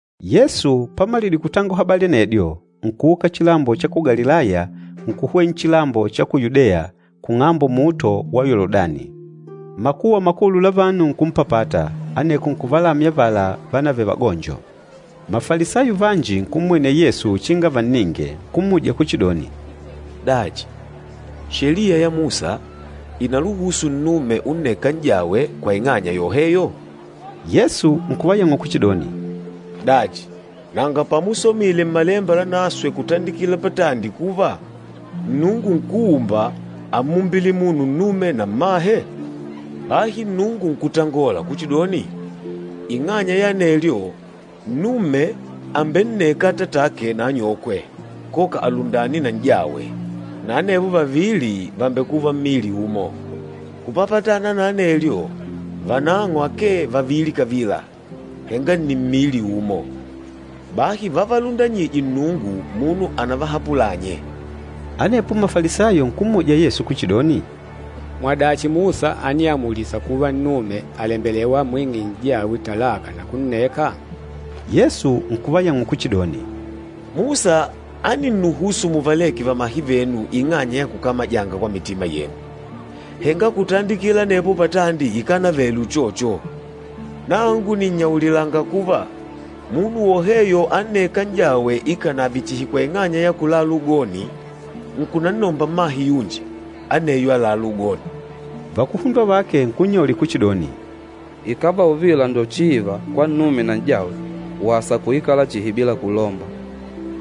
Yesu pamalidile kutangola habali anedyo, nkuuka chilambo cha ku Galilaya nkuhwena nchilambo cha ku Yudeya, pang'ambo luhunde lwa Yoludani. Makuwa makulu la vanu nkumpapata, aneko nkuvalamya avala vánavele vagonjo. Mafalisayo vanji nkummwenela Yesu uchinga vanninge, nkummuja kuchidoni, “Dachi Sheliya ya Musa ìnaluhusu nnume unneka n'jawe kwa ing'anya yoheyo?” Yesu nkuvayang'ula kuchidoni, “Dachi, nanga pamusomile Mmalemba Lanaswe kutandikila patandi kuva, ‘Nnungu Nkúumba, ámmumbile munu nnume na mmahe?’ Bahi Nnungu nkutangola kuchidoni, ‘Ing'anya ya anelyo, nnume àmbenneka atatake na anyokwe, koka alundane na n'jawe, na anevo vavili vàmbekuva mmili umo?’ Kupapatana na anelyo, vanang'o akee vavili kavila, henga nni mmili umo. Bahi vavalundanyîje Nnungu, munu anavahapulânye.” Anepo Mafalisayo nkummuja Yesu kuchidoni, “Mwadachi Musa ániamulisa kuva nnume àlembelewa amwing'e n'jawe talaka na kunneka?” Yesu nkuvayang'ula kuchidoni, “Musa áninnuhusu muvaleke vamahe venu ing'anya ya kukamajanga kwa mitima yenu. Henga kutandikila anepo patandi ikánavele uchocho. Nangu nìnnyaulilanga kuva, munu woheyo annêka n'jawe ikànave chihi kwa ing'anya ya kulala ugoni, nkunannomba mmahe yunji, aneyo àlalá ugoni.” Vakuhundwa vake nkunnyaulila kuchidoni, “Ikàva uvila njo chiiva kwa nnume na n'jawe, wasa kuikala chihi bila kulomba.”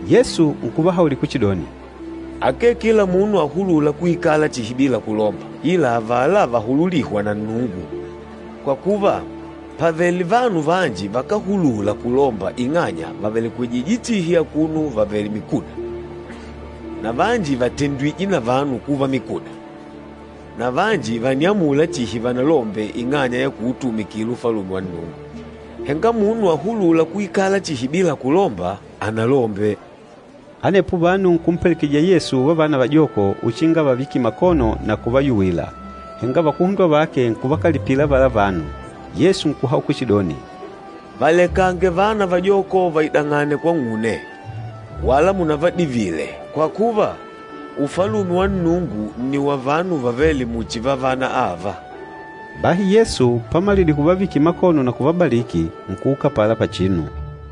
Yesu nkuvahaulila kuchidoni, “Akee kila munu ahulûla kuikala chihi bila kulomba, ila avala vahululîhwa na Nnungu. Kwa kuva, pàvele vanu vanji vakáhulula kulomba ing'anya vávelekwejije chihi akuno vavèlè mikuda, na vanji vàtendwije na vanu kuva mikuda, na vanji vàniamula chihi vanalombe ing'anya ya kuutumikila Ufalume wa Nnungu. Henga munu ahulûla kuikala chihi bila kulomba, analombe.” Anepo vanu nkumpelekejija Yesu vavana vajoko uchinga avavikile makono na kuvayuwila, henga vakuhundwa vake nkuvakalipila avala vanu. Yesu nkuhaula kuchidoni, “Valekange vana vajoko vaidang'ane kwang'une, wala munavadivile, kwa kuva, Ufalume wa Nnungu nni wa vanu vavêle muchi vavana ava.” Bahi Yesu pamalidile kuvavikila makono na kuvabaliki, nkuuka apala pachinu.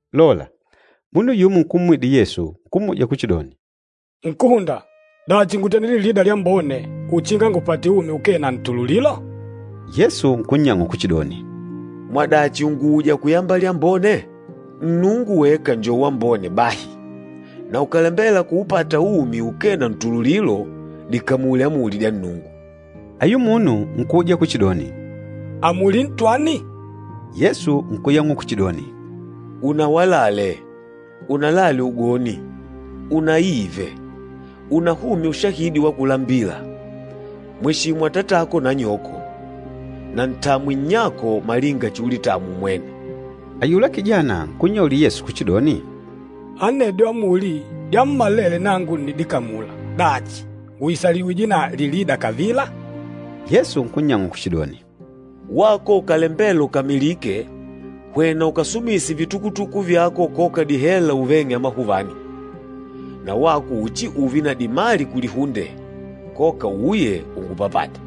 Lola, munu yumo nkumwidila Yesu, nkummuja kuchidoni, “Nkúhunda, dachi, ngútende lilida lyambone, uchinga ngupate umi ukee na ntululilo?” Yesu nkunnyang'ula kuchidoni, “Mwadachi ùnguuja kuyamba lyambone? Nnungu weka njo wambone bahi. Na ukàlembela kuupata umi ukee na ntululilo, dikamule amuli dya Nnungu.” Ayula munu nkuuja kuchidoni, “Amuli ntwani?” Yesu nkuyang'ula kuchidoni, “Unawalale, unalale ugoni, unaive, unahumye ushahidi wa kulambila, mweshimu atatako na anyoko, na ntamwe nnyako malinga chiulitamwa umwene.” Ayula kijana nkunnyaulila Yesu kuchidoni, “Anedyo amuli dyammalele nangu ǹnidikamula. Dachi, ngùisalijiwije na lilida kavila?” Yesu nkunnyang'ula kuchidoni, “Wako ukàlembela ukamilike, hwena ukasumise vitukutuku vyako koka dihela uveng'e amahuvani. Na wako uchiuve na dimali kulihunde, koka uuye ungupapate.”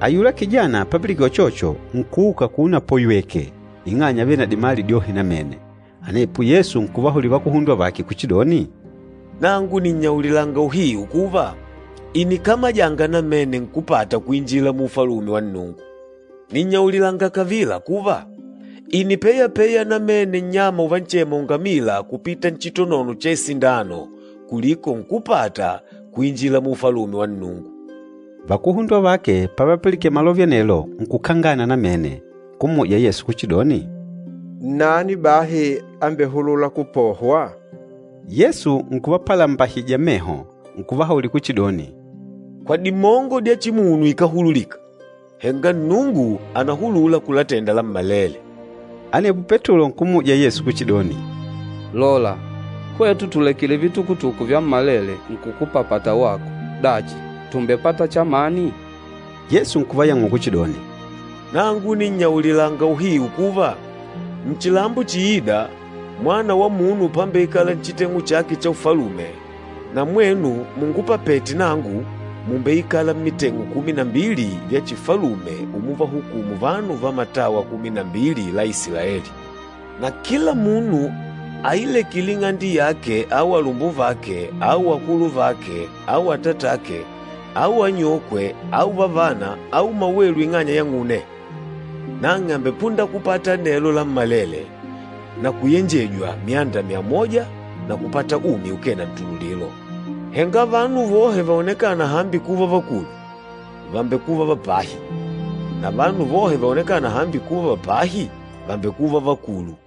Ayula kijana papilikene uchocho, nkuuka akuno apoywèkè ing'anya ávele na dimali dyohe namene. Anepo Yesu nkuvahaulila vakuhundwa vake kuchidoni, “Nangu nìnnyaulilanga uhiu kuva, ìnikamajanga namene nkúpata kuinjila mu Ufalume wa Nnungu. Nìnnyaulilanga kavila kuva, ìnipeyapeya namene nnyama uvanchema ungamila kupita nchitonono cha isindano kuliko nkúpata kuinjila mu Ufalume wa Nnungu.” Vakuhundwa vake pavapilikene malove anelo nkukangana namene, nkummuja Yesu kuchidoni, “Nnani bahi ambehulûla kupohwa?” Yesu nkuvapalambahija meho, nkuvahaulila kuchidoni, “Kwa dimongo dya chimunu ikáhululika, henga Nnungu ànahulula kulatenda lammalele.” Anepo Petulo nkummuja Yesu kuchidoni, “Lola, hwetu tùlekile vitukutuku vyammalele nkukupapata wako! Dachi, tùmbepata chamani?” Yesu nkuvayang'ula kuchidoni, “Nangu nìnnyaulilanga uhiu kuva, nchilambo chiîda, Mwana wa Munu pambeikala nchiteng'u chake cha Ufalume, na mwenu mungupapete nangu mùmbeikala mmiteng'u kumi na mbili vya chifalume umuvahukumu vanu va matawa kumi na mbili la Isilaeli. Na kila munu ailekîle ing'ande yake au alumbuvake au akuluvake au atatake au anyokwe au vavana au mawelu ing'anya yang'une, nang'e àmbepunda kupata anelo lammalele na kuyenjejwa myanda myamoja na kupata umi ukee na ntululilo. Henga vanu vohe vaonekâna hambi kuva vakulu, vàmbekuva va pahi, na vanu vohe vaonekâna hambi kuva va pahi, vàmbekuva vakulu.”